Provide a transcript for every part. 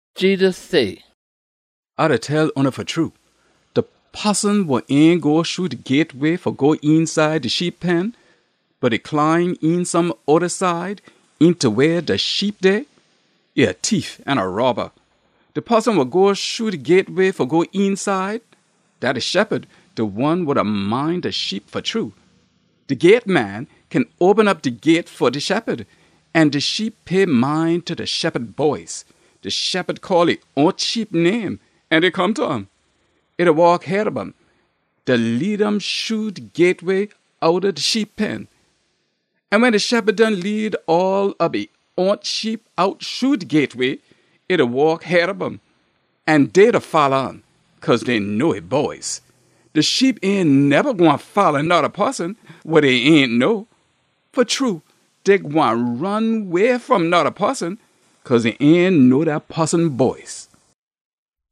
Jedus say, “A da tell oona fa true, de poson wa ain go shru de gyateway fa go eenside de sheep pen, bot e climb een some oda side eenta weh de sheep dey, e a tief an a robba. De poson wa go shru de gyateway fa go eenside, dat de shephud, de one wa da mind de sheep fa true. De gyateman kin open op de gyate fa de shephud, an de sheep pay mind ta de shephud boice. De shephud call e own sheep name, an dey come ta um. E da waak head ob um, da lead um shru de gyateway outta de sheep pen. An wen de shephud done lead all ob e own sheep out shru de gyateway, e da waak head ob um. An dey da folla um, cause dey know e boice. De sheep ain neba gwine folla noda poson wa dey ain know. Fa true, dey gwine ron way fom noda poson, cause dey ain know dat poson boice.”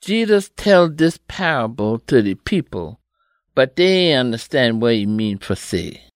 Jedus tell dis paable ta de people, bot dey ain ondastan wa e mean fa say.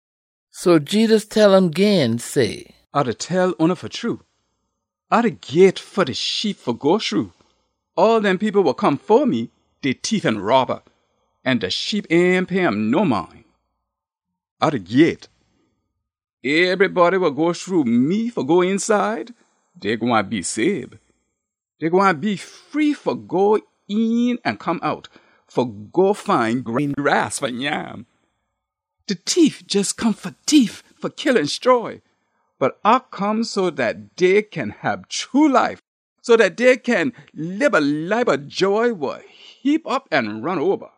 So Jedus tell um gin say, “A da tell oona fa true, A de gyate fa de sheep fa go shru. All dem people wa come fo me, dey tief an robba, an de sheep ain pay um no mind. A de gyate. Ebrybody wa go shru me fa go eenside, dey gwine be sabe. Dey gwine be free fa go een an come out fa go find green grass fa nyam. De tief jes come fa tief, fa kill an stroy. Bot A come so dat dey kin hab true life, so dat dey kin lib a life ob joy wa heap op an ron oba.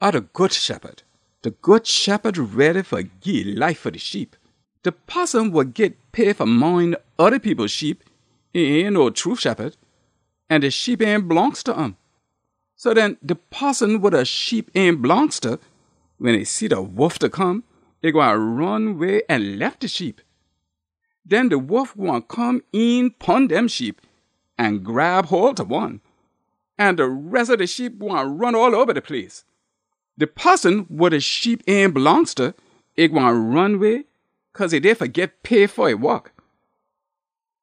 A de good shephud. De good shephud ready fa gii e life fa de sheep. De poson wa git pay fa mind oda people sheep, e ain no true shephud, an de sheep ain blongst ta um. So den, de poson wa de sheep ain blongst ta, wen e see de wolf da come, e gwine ron way an lef de sheep. Den de wolf gwine come een pon dem sheep an grab hole ta one. An de res ob de sheep gwine ron all oba de place. De poson wa de sheep ain blongst ta, e gwine ron way cause e dey fa git pay fa e wok.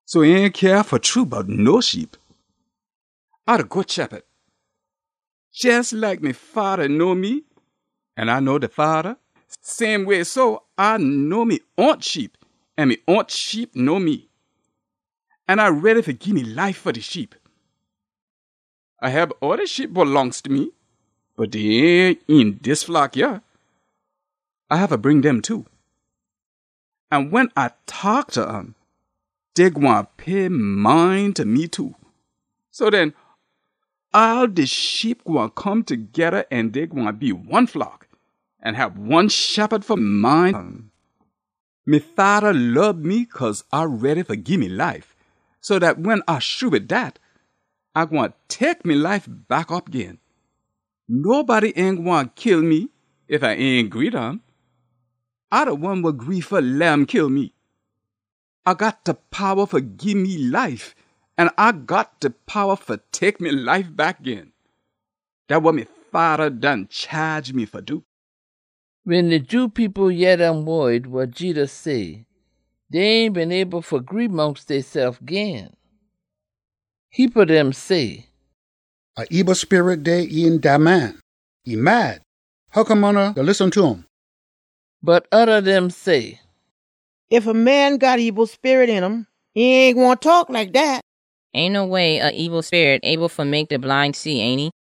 So e ain cyah fa true bout no sheep. A de good shephud. Jes like de Fada know me an A know de Fada, same way so A know me own sheep an me own sheep know me. An A ready fa gii me life fa de sheep. A hab oda sheep wa blongst ta me, bot dey ain een dis flock yah. A haffa bring dem too. An wen A taak ta um, dey gwine pay mind ta me too. So den, all de sheep gwine come togeda an dey gwine be one flock an hab one shephud fa mind um. Me Fada lob me cause A ready fa gii me life, so dat wen A shru wid dat, A gwine tek me life back op gin. Nobody ain gwine kill me ef A ain gree ta um. A de one wa gree fa leh um kill me. A got de powa fa gii me life, an A got de powa fa tek me life back gin. Dat wa me Fada done chaage me fa do.” Wen de Jew people yeh dem wod wa Jedus say, dey ain been able fa gree mongst deysef gin. Heapa dem say, “A ebil sperit dey een dat man! E mad! Hoccome oona da listen ta um?” Bot oda dem say, “Ef a man got a ebil sperit een um, e ain gwine taak like dat! Ain no way a ebil sperit able fa mek de bline see, ainty?”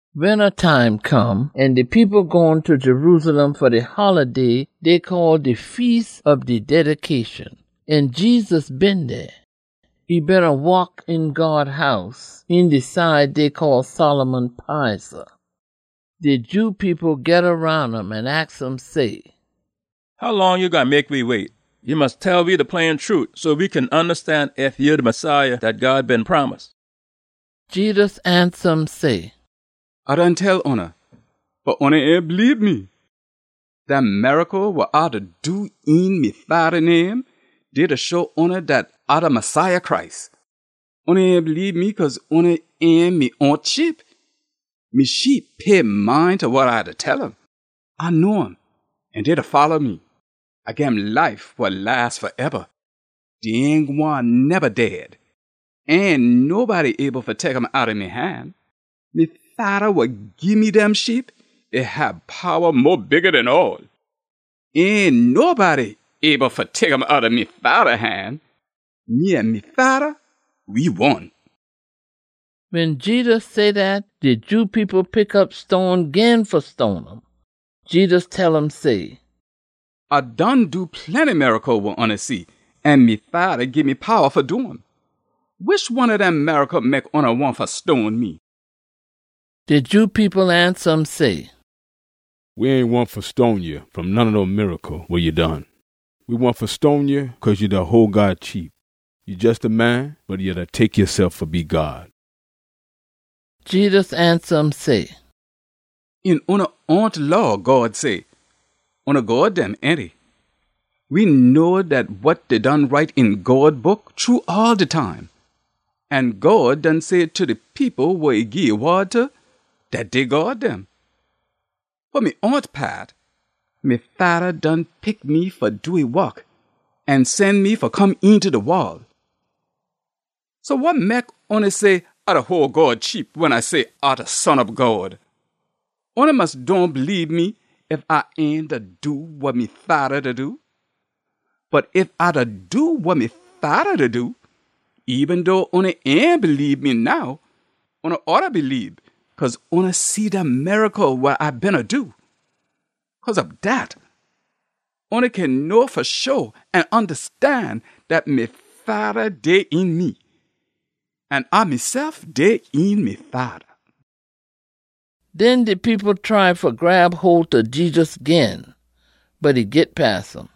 Winta time come, an de people gone ta Jerusalem fa de holiday dey call de Feas ob de Dedication. An Jedus been dey. E beena waak een God House, een de side dey call Solomon Piza. De Jew people geda roun um an aks um say, “How long ya gwine mek we wait? Ya mus tell we de plain trute so we kin ondastan ef ya de Messiah dat God been promise.” Jedus ansa um say, “A done tell oona, bot oona ain bleebe me. Dem miracle wa A da do een me Fada name, dey da show oona dat A de Messiah Christ. Oona ain bleebe me cause oona ain me own sheep. Me sheep pay mind ta wa A da tell um. A know um, an dey da folla me. A gim life wa las faeba. Dey ain gwine neba dead. Ain nobody able fa tek um outta me han. Me Fada wa gii me dem sheep, e hab powa mo bigga den all. Ain nobody able fa tek um outta me Fada han. Me an me Fada, we one.” Wen Jedus say dat, de Jew people pick op stone gin fa stone um. Jedus tell um say, “A done do plenty miracle wa oona see, an me Fada gii me powa fa do um. Wish one ob dem miracle mek oona wahn fa stone me?” De Jew people ansa um say, “We ain wahn fa stone ya fa none ob dem miracle wa ya done. We wahn fa stone ya cause ya da hole God cheap. Ya jes a man, bot ya da tek yasef fa be God!” Jedus ansa um say, “Een oona own Law, God say, ‘Oona god dem,’ ainty? We know dat wa dey done write een God Book true all de time. An God done say ta de people wa e gii e wod ta, dat dey god dem. Fa me own paat, me Fada done pick me fa do e wok an sen me fa come eenta de wol. So wa mek oona say A da hole God cheap wen A say A de Son ob God? Oona mus dohn bleebe me ef A ain da do wa me Fada da do. Bot ef A da do wa me Fada da do, eben dough oona ain bleebe me now, oona oughta bleebe cause oona see dem miracle wa A beena do. Cause ob dat, oona kin know fa sho an ondastan dat me Fada dey een me, an A mesef dey een me Fada.” Den de people try fa grab hole ta Jedus gin, bot e git pass um.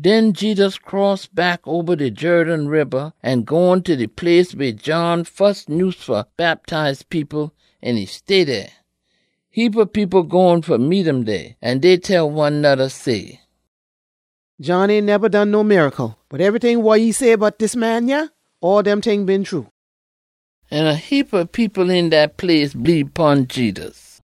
Den Jedus cross back oba de Jerden Riba an gone ta de place weh John fus nyuse fa bactize people, an e stay dey. Heapa people gone fa meet um dey, an dey tell one noda say, “John ain neba done no miracle, bot ebryting wa e say bout dis man yah, all dem ting been true.” An a heapa people een dat place bleebe pon Jedus.